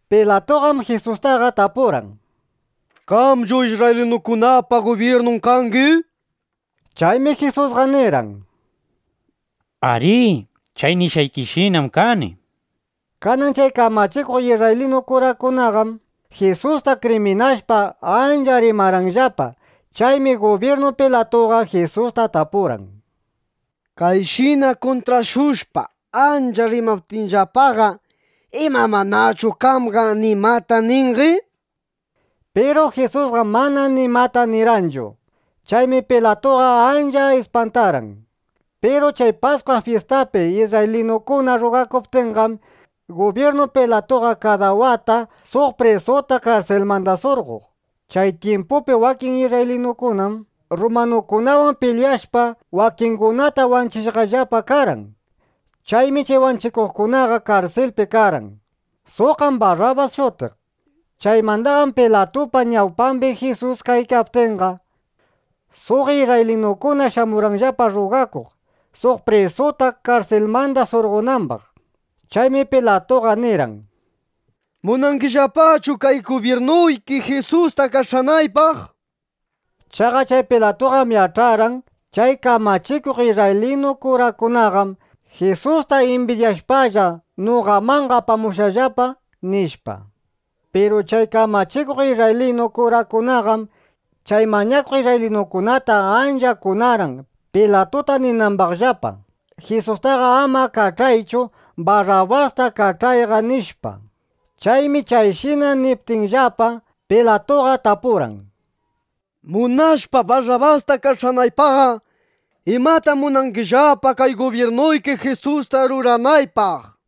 Pilatuqam Jisustaqa tapurqan: —¿Qamchu isrraylinukunapa gubyirnun kangi? Chaymi Jisusqa nirqan: —Arí, chay nishqaykishinam kani, nishpa. Kanan chay kamachikuq isrraylinu kurakunaqam Jisusta kriminashpa, ancha rimarqanllapa. Chaymi gubyirnu Pilatuqa Jisusta tapurqan: —Kayshina kuntrashushpa ancha rimaptinllapaqa ¿ima manachu qamqa nimata ningi? nishpa. Piru Jisusqam mana nimata nirqanchu. Chaymi Pilatuqa ancha ispantarqan. Piru chay Paskwa fyistapi isrraylinukuna rrugakuptinqam, gubyirnu Pilatuqa kada wata suq prisuta karsilmanda surqoq. Chay tyimpupi wakin isrraylinukunam rrumanukunawan pilyashpa, wakingunata wanchishqallapa karqan. Chaymi chay wanchikuqkunaqa karsilpi karqan. Suqqam Barrabas shutiq. Chaymandaqam Pilatupa ñawpambi Jisus kaykaptinqa, suq isrraylinukuna shamurqanllapa rrugakuq, suq prisuta karsilmanda surqonambaq. Chaymi Pilatuqa nirqan: —¿Munangillapachu kay gubyirnuyki Jisusta kach'anaypaq? nishpa. Chaqa chay Pilatuqam yach'arqan: Chay kamachikuq isrraylinu kurakunaqam Jisusta imbidyashpalla, noqamanqa apamushqallapa, nishpa. Piru chay kamachikuq isrraylinu kurakunaqam chay mañakuq isrraylinukunata ancha kunarqan, Pilatuta ninambaqllapa: —Jisustaqa ama kach'aychu. Barrabasta kach'ayqa, nishpa. Chaymi chayshina niptinllapa, Pilatuqa tapurqan: —Munashpa Barrabasta kach'anaypaqqa, ¿imatam munangillapa kay gubyirnuyki Jisusta ruranaypaq? nishpa.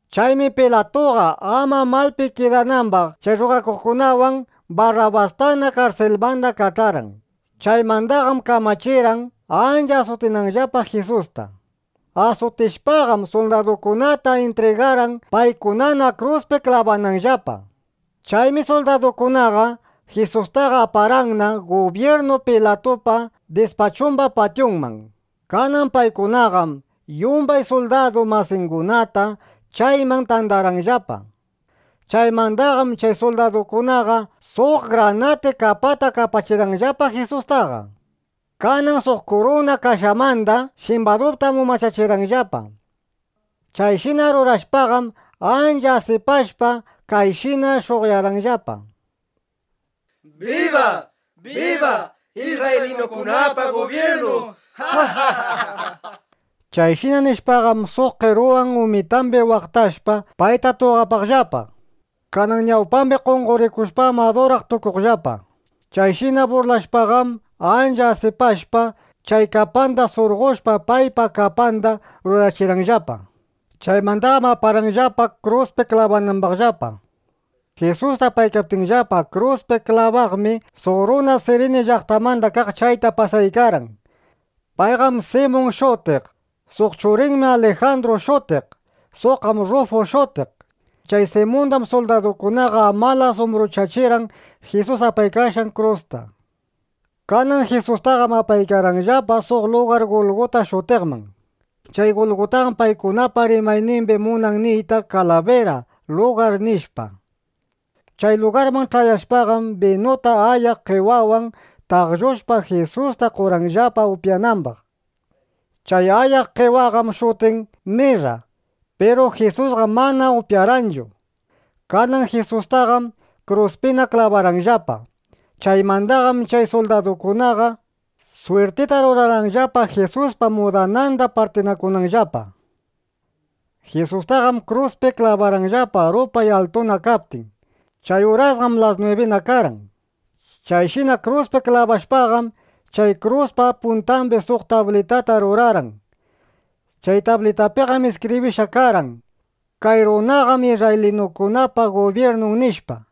Chaymi Pilatuqa ama malpi kidanambaq chay rrugakuqkunawan, Barrabastana karsilmandaqa kach'arqan. Chaymandaqam kamachirqan, ancha asutinanllapa Jisusta. Asutichishpaqam, suldadukunata intrigarqan, paykunana kruspi klabananllapa. Chaymi suldadukunaqa Jisustaqa aparqanna gubyirnu Pilatupa dispachumba patyunman. Kanan paykunaqam yumbay suldadu masingunata chayman tandarqanllapa. Chaymandaqam chay suldadukunaqa suq granati kapata kapachirqanllapa Jisustaqa. Kanan suq kuruna kashamanda shimbadutam umachachirqanllapa. Chayshina rurashpaqam, ancha asipashpa, kayshina sh'uqyarqanllapa: —¡Biba, biba isrraylinukunapa gubyirnun! nishpa. Chayshina nishpaqam, suq qeruwan umitambi waqtashpa, payta tuqapaqllapa. Kanan ñawpambi qonqorikushpam, aduraq tukuqllapa. Chayshina burlashpaqam ancha asipashpa, chay kapata surqoshpa, paypa kapandana rurachirqanllapa. Chaymandaqam aparqanllapana, kruspi klabananllapa. Jisusta apaykaptinllapa kruspi klabaqmi, suq runa Sirini llaqtamanda kaq chayta pasaykarqan. Payqam Simun shutiq. Suq churinmi Alijandru shutiq. Suqqam Rrufu shutiq. Chay Simundam suldadukunaqa amalas umbruchachirqan Jisus apaykashqan krusta. Kanan Jisustaqam apaykarqanllapa suq lugar Gulguta shutiqman. Chay Gulgutaqam paykunapa rimaynimbiqa munan niyta “Kalabira Lugar”, nishpa. Chay lugarman ch'ayashpaqam, binuta ayaq qewawan taqllushpa, Jisusta qorqanllapa upyanambaq. Chay ayaq qewaqam shutin mirra. Piru Jisusqam mana upyarqanchu. Kanan Jisustaqam kruspina klabarqanllapa. Chaymandaqam chay suldadukunaqa swirtita rurarqanllapa, Jisuspa mudananda partinakunanllapa. Jisustaqam kruspi klabarqanllapa rupay altuna kaptin. Chay urasqam las nwibina karqan. Chayshina kruspi klabashpaqam, chay kruspa puntambi suq tablitata rurarqan. Chay tablitapiqam iskibrishqa karqan: “Kay runaqam isrraylinukunapa gubyirnun” nishpa.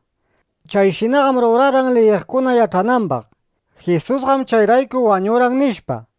Chayshinaqam rurarqan, liyiqkuna yach'anambaq: Jisusqam chayrayku wañurqan, nishpa.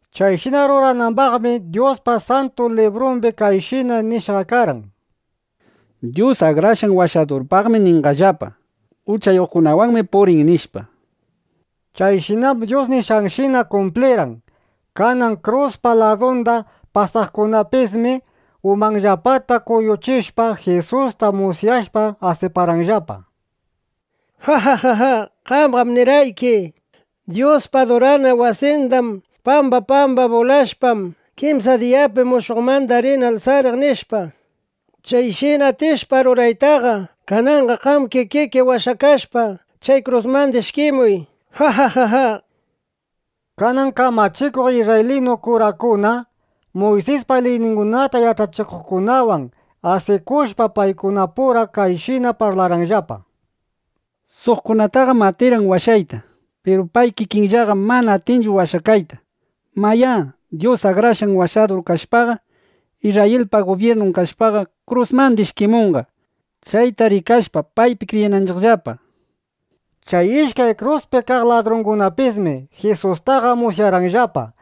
Chayshina ruranambaqmi Dyuspa Santu Librumbi kayshina nishqa karqan: “Dyus Akrashqan Washadurpaqmi ninqallapa: ‘Uchayuqkunawanmi purin’”, nishpa. Chayshinam Dyus nishqanshina kumplirqan.˼ Kanan kruspa ladunda pasaqkunapismi umanllapata kuyuchishpa, Jisusta musyashpa, asiparqanllapa: —¡Jajáy! Qamqam nirqayki: “Dyuspa adurana wasinda pamba pamba bulashpam, kimsa diyapi mushuqmanda rini alsariq”, nishpa. Chayshina atishpa ruraytaqa, kananqa qam kikiki washakashpa, chay krusmanda ishkimuy, nishpa. Kanan kamachikuq isrraylinu kurakuna, Muysispa liyningunata yach'achikuqkunawan asikushpa, paykunapura kayshina parlarqanllapa: —Suqkunataqam atirqan washayta. Piru pay kikinllaqam manana atinchu washakayta. Mayá, Dyus Akrashqan Washadur kashpa, Isrrayilpa gubyirnun kashpaqa, krusmanda ishkimunqa, chayta rikashpa, paypi kriyinanchiqllapa, nishpa. Chay ishkay kruspi kaq ladrungunapismi Jisustaqa musyarqanllapa.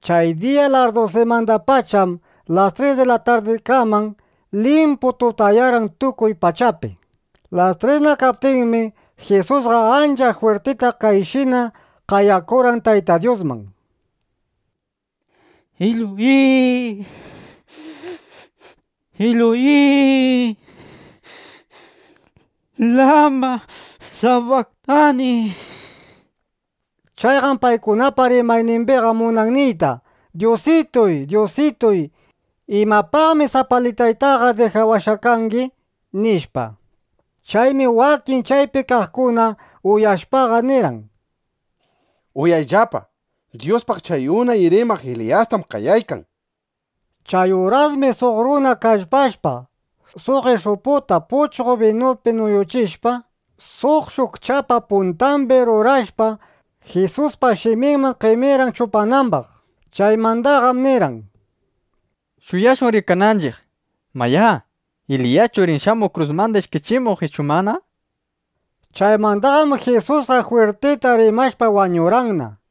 Chay diya larrdusimandapacham las tres di la tardikaman limpu tutayarqan tukuy pachapi. Las tresna kaptinmi, Jisusqa ancha jwirtita kayshina qayakurqan Tayta Dyusman: —Eloi, Eloi, ¿lama sabaktani? Chayqam paykunapa rimaynimbiqa munan niyta: “Dyusituy, Dyusituy, ¿imapaqmi sapalitaytaqa dijawashqa kangi?” nishpa. Chaymi wakin chaypi kaqkuna uyashpaqa nirqan: —Uyayllapa, Dyuspaq chay unay rimaq Eliyastam qayaykan, nishpa. Chay urasmi suq runa kallpashpa, suq ish'uputa puchqo binupi nuyuchishpa, suq shukchapa puntambi rurashpa, Jisuspa shiminman qemirqan chupanambaq. Chaymandaqam nirqan: —Shuyashun rikananchiq, mayá, ¿Eliyaschu rin shamuq krusmanda ishkichimuq ichu mana? nishpa. Chaymandaqam Jisusqa jwirtita rimashpa wañurqanna.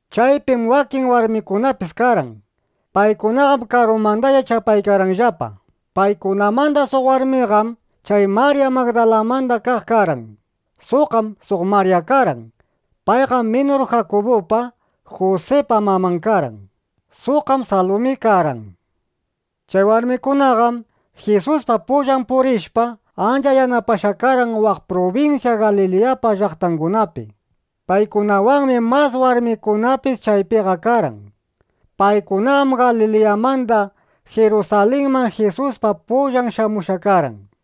Chaypim wakin warmikunapis karqan. Paykunaqam karumandalla chapaykarqanllapa. Paykunamanda suq warmiqam chay Marya Magdalamanda kaq karqan. Suqqam suq Marya karqan. Payqam minur Jakubupa, Jusipa maman karqan. Suqqam Salumi karqan. Chay warmikunaqam Jisuspa pullan purishpa, ancha yanapashqa karqan waq prubinsya Galiliyapa llaqtangunapi. Paykunawanmi mas warmikunapis chaypiqa karqan. Paykunaqam Galiliyamanda Jirusalinman Jisuspa pullan shamushqa karqan.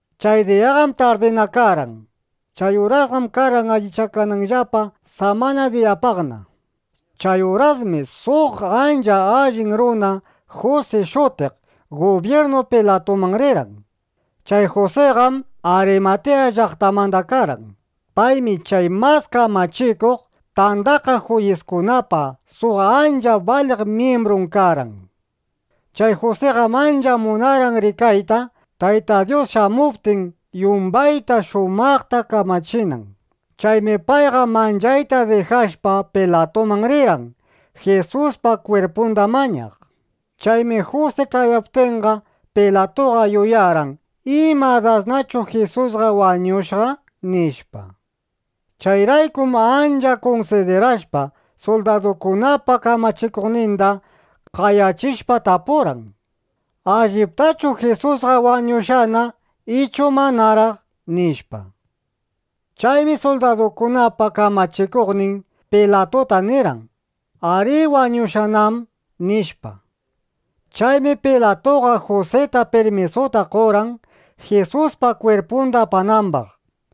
Chay diyaqam tardina karqan. Chay urasqam karqan allichakananllapa samana diyapaqna. Chay urasmi suq ancha allin runa Jusi shutiq gubyirnu Pilatuman rirqan. Chay Jusiqam Arimatiya llaqtamanda karqan. Paymi chay Mas Kamachikuq Tandakaq Juyiskunapa suq ancha baliq myimbrun karqan. Chay Jusiqam ancha munarqan rikayta, Tayta Dyus shamuptin yumbayta shumaqta kamachinan. Chaymi payqa manchayta dijashpa, Pilatuman rirqan, Jisuspa kwirpunda mañaq. Chaymi Jusi ch'ayaptinqa, Pilatuqa yuyarqan: ¿Ima dasnachu Jisusqa wañushqa? nishpa. Chayraykum ancha kunsidirashpa, suldadukunapa kamachikuqninda qayachishpa tapurqan: —¿Alliptachu Jisusqa wañushqana ichu manaraq? nishpa. Chaymi suldadukunapa kamachikuqnin Pilatuta nirqan: —Arí, wañushqanam, nishpa. Chaymi Pilatuqa Jusita pirmisuta qorqan, Jisuspa kwirpunda apanambaq.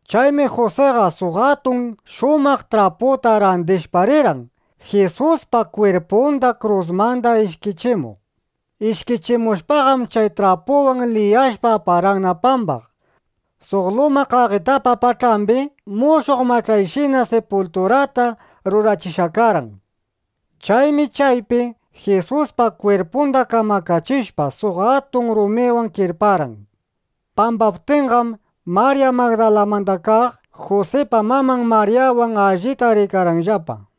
Chaymi Jusiqa suq atun shumaq traputa randishpa rirqan, Jisuspa kwirpunda krusmanda ishkichimuq. Ishkichimushpaqam, chay trapuwan liyashpa, aparqanna pambaq. Suq luma qaqitapa pach'ambi mushuq mach'ayshina sipulturata rurachishqa karqan. Chaymi chaypi Jisuspa kwirpunda kamakachishpa, suq atun rumiwan kirparqan. Pambaptinqam Marya Magdalamanda kaq, Jusipa maman Maryawan allita rikarqanllapa.